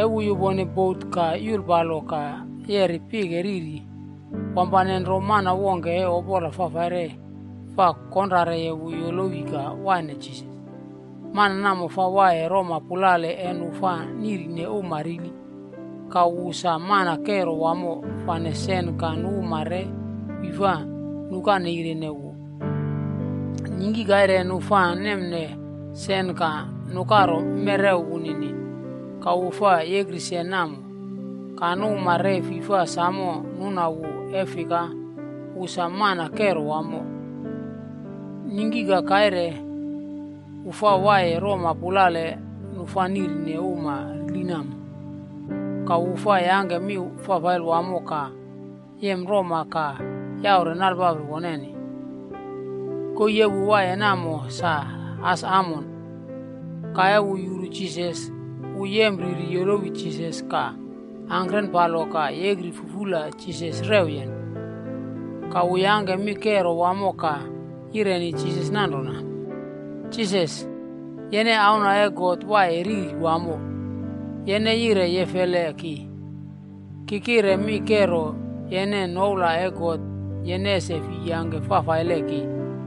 E wu yupone bot ka yulpalo ka yeri pike riri, wampane nro mana wongke e opola fafaile fa konrare wu yolowi ka wane Jisas. Mana namo fa waiye roma pulale e nu fa niꞌri uma rili. Ka wu sa mana kero wamo fane sen ka nu uma re fi fa nukaneirene wu. Ningki kaire nu fa nemne sen ka nukaro mewrew wunini. Ka wu fa yekri sen namo. Ka nu uma re fi fa samo nuna wu e fika, wu sa mana kero wamo. Ningki ka kaire, wu fa waiye roma pulale nu fa niꞌrine uma rili namo. Ka wu fa yangke mi fafaile wamo ka yem roma ka yaure nalpapri woneni. Koii e wu waiye namo sa as amon. Ka e wu yuru Jisas, wu yempreri yolowi Jisas ka angkrenpalo ka yekri fufula Jisas rewyen. Ka wu yangke mi kero wamo ka yireni Jisas nanrona, “Jisas, yene Auna e God Waiye Riri Wamo. Yene yire yefeleye ki? Ki kire mi kero yene noula e God yene ese fi yangke fafaile ki!”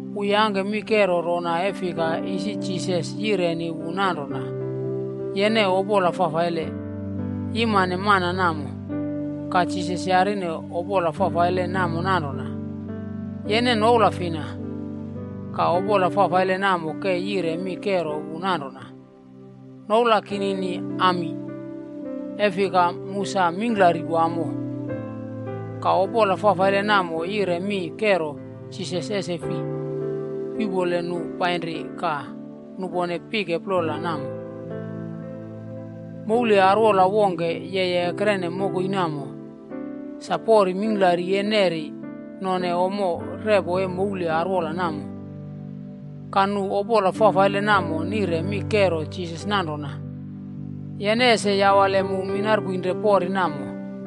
Wu yangke mi kero rona e fika, isi Jisas yireni wu nanrona, “Yene opola fafaile. Yimane mana namo.” Ka Jisas yarine opola fafaile namo nanrona, “Yene noula fina?” Ka opola fafaile namo ke yire mi kore wu nanrona, “Noula kinini Ami. E fika, mu sa mingklari wamo.” Ka opola fafaile namo yire mi kero Jisas ese fi yuꞌpole nu painri ka nupone pike plola namo. Moule arwola wongke yeye ekrene mokoi namo. Sa pori mingklari e neri none ommo repo e moule arwola namo. Ka nu opola fafaile namo nire mi kero Jisas nanrona, “Yene ese yawale mu minarpoinre pori namo.”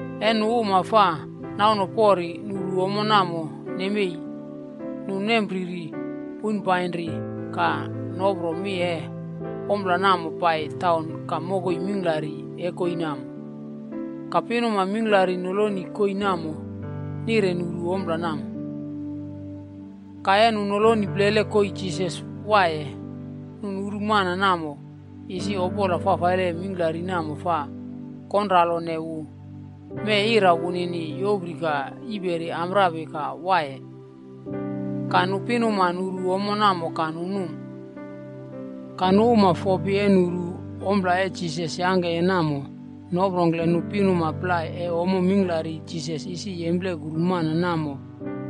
E nu uma fa nauno pori nuru ommo namo nemei, nu nempreri poipainri ka nopro mi e ompla namo pai taun ka mokoi mingklari e koii namo. Ka pinuma mingklari noloni koii namo nire nuru ompla namo. Ka e nu noloni plele koii Jisas waiye, nu nuru mana namo, isi opola fafaile mingklari namo fa konralone wu. Mee ira wunini yopri ka yiperi amprapi ka waiye. Ka nu pinuma nuru ommo namo ka nu num. Ka nu uma fopi e nuru ompla e Jisas yangkeye namo noprongkle nu pinuma plai e ommo mingklari Jisas isi yemplekuru mana namo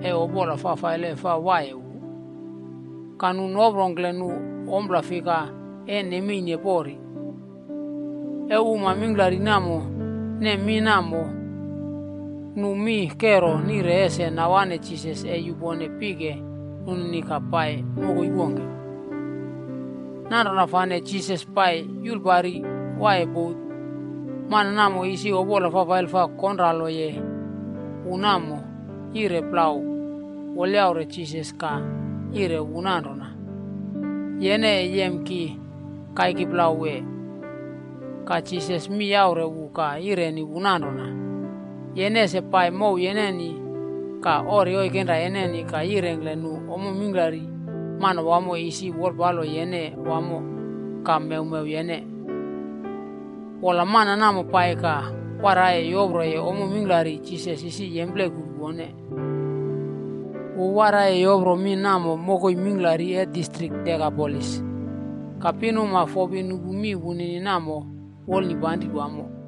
e opola fafaile fa waiye wu. Ka nu noprongkle nu ompla fika e nemeine pori. E uma mingklari namo nem mi namo, nu mi kero nire ese nawane Jisas e yupone pike nunini ka pai mokoi wongke. Nanrona fane Jisas pai yulpari waiye bot, mana namo isi opola fafaile fa konraloye wu namo, yire plau wolyaure Jisas ka yireni wu nanrona, “Yene e yem ki kaiki plau wee?” Ka Jisas mi yaure wu ka yireni wu nanrona, “Yene ese pai mow yeneni ka ori oikenra yeneni ka yirengkle nu ommo mingklari Manawamo isi wolpalo yene wamo ka mewmew yene.” Wola, mana namo pai ka waraiye yoproye ommo mingklari Jisas isi yemplekuru wone. Wu waraiye yopro mi namo mokoi mingklari e distrik Dekapolis.a Ka pinuma fopi nupu mi wunini namo wolnipanri wamo.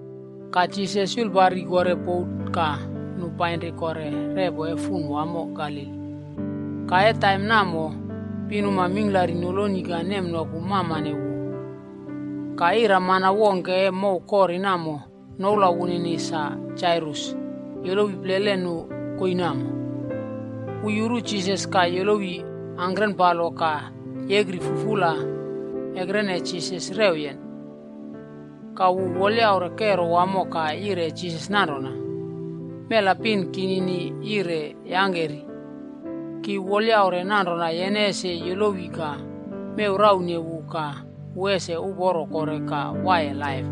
Ka Jisas yulpari kore bot ka nu painri kore repo e fun wamo Galili. Ka e taim namo, pinuma mingklari noloni ka nemnoku mamane wu. Ka iramana wongke e mow kori namo noula wunini sa Jairus yolowi plele nu koii namo. Wu yuru Jisas ka yolowi angkrenpalo ka yekri fufula ekrene Jisas rewyen. Ka wu wolyaure kero wamo ka yire Jisas nanrona, “Mela pin kinini yire yangke ri. Ki wolyaure nanrona yene ese yolowi ka mew raune wu ka wu ese uporo kore ka waiye laip.”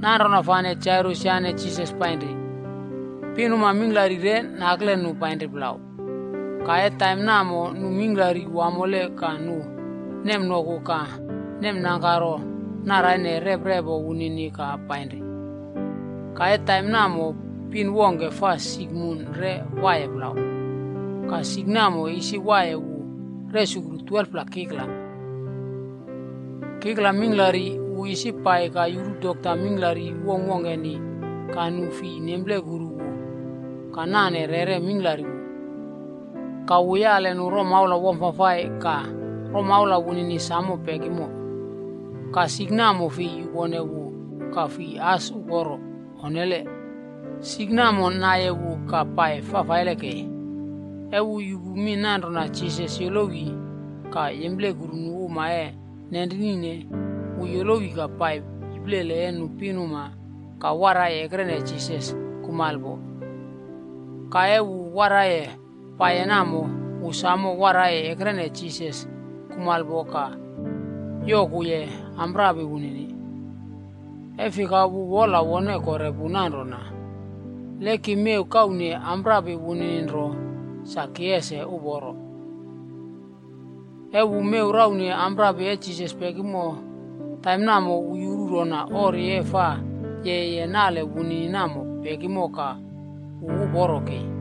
Nanrona fane, Jairus yane Jisas painri. Pinuma mingklari re nakle nu painri plau. Ka e taim namo nu mingklari wamole ka nu nemnoku ka nemnangkaro naraine reprepo wunini ka painri. Ka e taim namo, pin wongke fa sik mun re waiye plau. Ka sik namo isi waiye wu resukru 12pla kikla. Kikla mingklari wu isi pai ka yuru dokta mingklari wongkwongkeni ka nu fi nemplekuru wu ka nane rere mingklari wu. Ka wu yale nu romaula wamfafai ka romaula wunini samo pekimo. Ka sik namo fi yupone wu ka fi as uporo, onnele. Sik namo naiye wu ka pai fafaile kei. E wu yupu mi nanrona Jisas yolowi ka yemplekuru nu uma e nenrinine, wu yolowi ka pai iplele e nu pinuma ka waraiye ekrene Jisas kumalpo. Ka e wu waraiye paiye namo, wu samo waraiye ekrene Jisas kumalpo ka yokuye amprapi wunini. E fika wu wola wone kore pu nanrona, “Le ki mew kaune amprapi wunini nro, sa ki ese uporo.” E wu mew raune amprapi e Jisas pekimo, taim namo, wu yuru rona ori e fa yeye nale wunini namo pekimo ka wu uporo kei.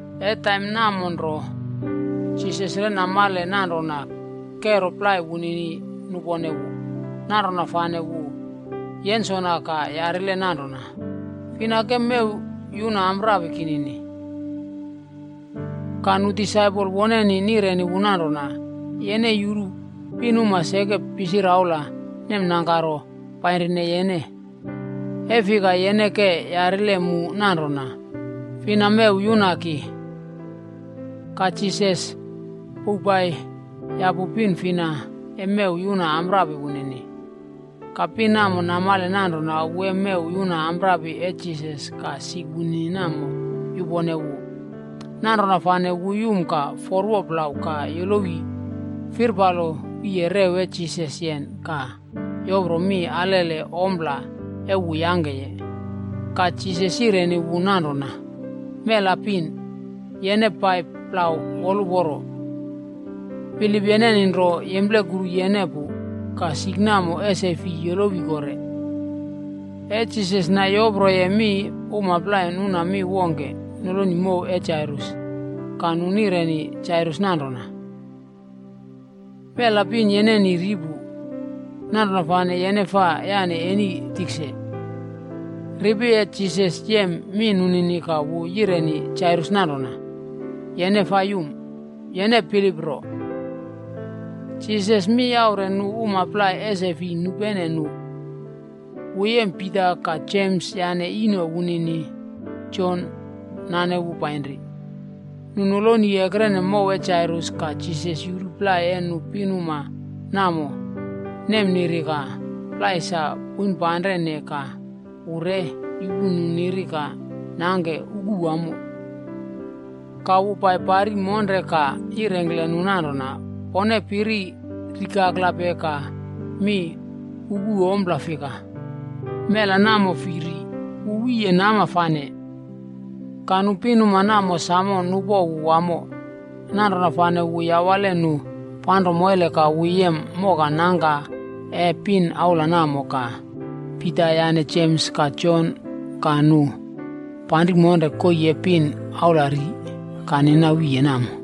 E taim namo nro, Jisas re namale nanrona kero plai wunini nupone wu. Nanrona fane wu yensona ka yarile nanrona, “Fina ke mew yuna amprapi kinini?” Ka nu disaipol woneni nireni wu nanrona, “Yene yuru pinuma seke pisiraula nemnangkaro painrine yene. E fika yene ke yarile mu nanrona, ‘Fina mew yuna ki?’” Ka Jisas pouwpai yapu pin fina e mew yuna amprapi wunini. Ka pin namo namale nanrona wu e mew yuna amprapi e Jisas ka sik wunini namo yupone wu. Nanrona fane wu yum ka forwo plau ka yolowi firpalo wiye rew e Jisas yen ka yopro mi alele ompla e wu yangkeye. Ka Jisas yireni wu nanrona, “Mela pin, yene pai plau woluporo. Bilip yeneni nro yemplekuru yene pu ka sik namo ese fi yolowi kore.” E Jisas nayoproye mi, uma plai nuna mi wongke noloni mow e Jairus. Ka nu nireni Jairus nanrona, “Mela pin yeneni ri pu. Nanrona fane yene fa yane eni tikse.” Ripi e Jisas yem mi nunini ka wu yireni Jairus nanrona, “Yene fa yum. Yene bilip nro.” Jisas mi yaure nu uma plai ese fi nupene nu. Wu yem Pita ka Jems yane ino wunini, Jon nane wu painri. Nu noloni ekrene mow e Jairus ka Jisas yuru plai e nu pinuma namo nemniri ka plai sa poinpanrene ka wu re yupu nu niri ka nangke uku wamo. Ka wu paipari monre ka yirengkle nu nanrona, “Pone piri rikaklape ka mi ukupe ompla fika? Mela namo fi ri, wu wiye nama fane.” Ka nu pinuma namo samo nupo wu wamo. Nanrona fane wu yawale nu panro moile ka wu yem moka nangka e pin aula namo ka Pita yane Jems ka Jon ka nu panri monre koii e pin aula ri ka nina wiye namo.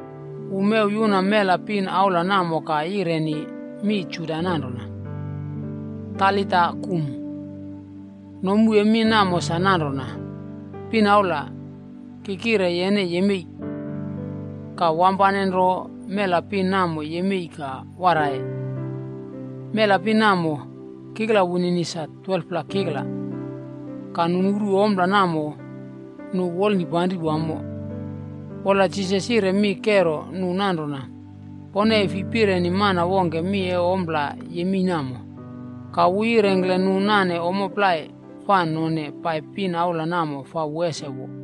Wu mew yuna mela pin aula namo ka yireni mi Juda nanrona, “Talita kum.” Nomu e mi namo sa nanrona, “Pin aula, ki kire yene yemei.” Ka wampane nro mela pin namo yemei ka waraiye. (Mela pin namo, kikla wunini sa 12pla kikla.) Ka nu nuru ompla namo, nu wolnipanri wamo. Wola Jisas yire mi kero nu nanrona, “Pone e fi pireni mana wongke mi e ompla yemei namo.” Ka wu yirengkle nu nane ommo plai fa none pai pin aula namo fa wu ese wo.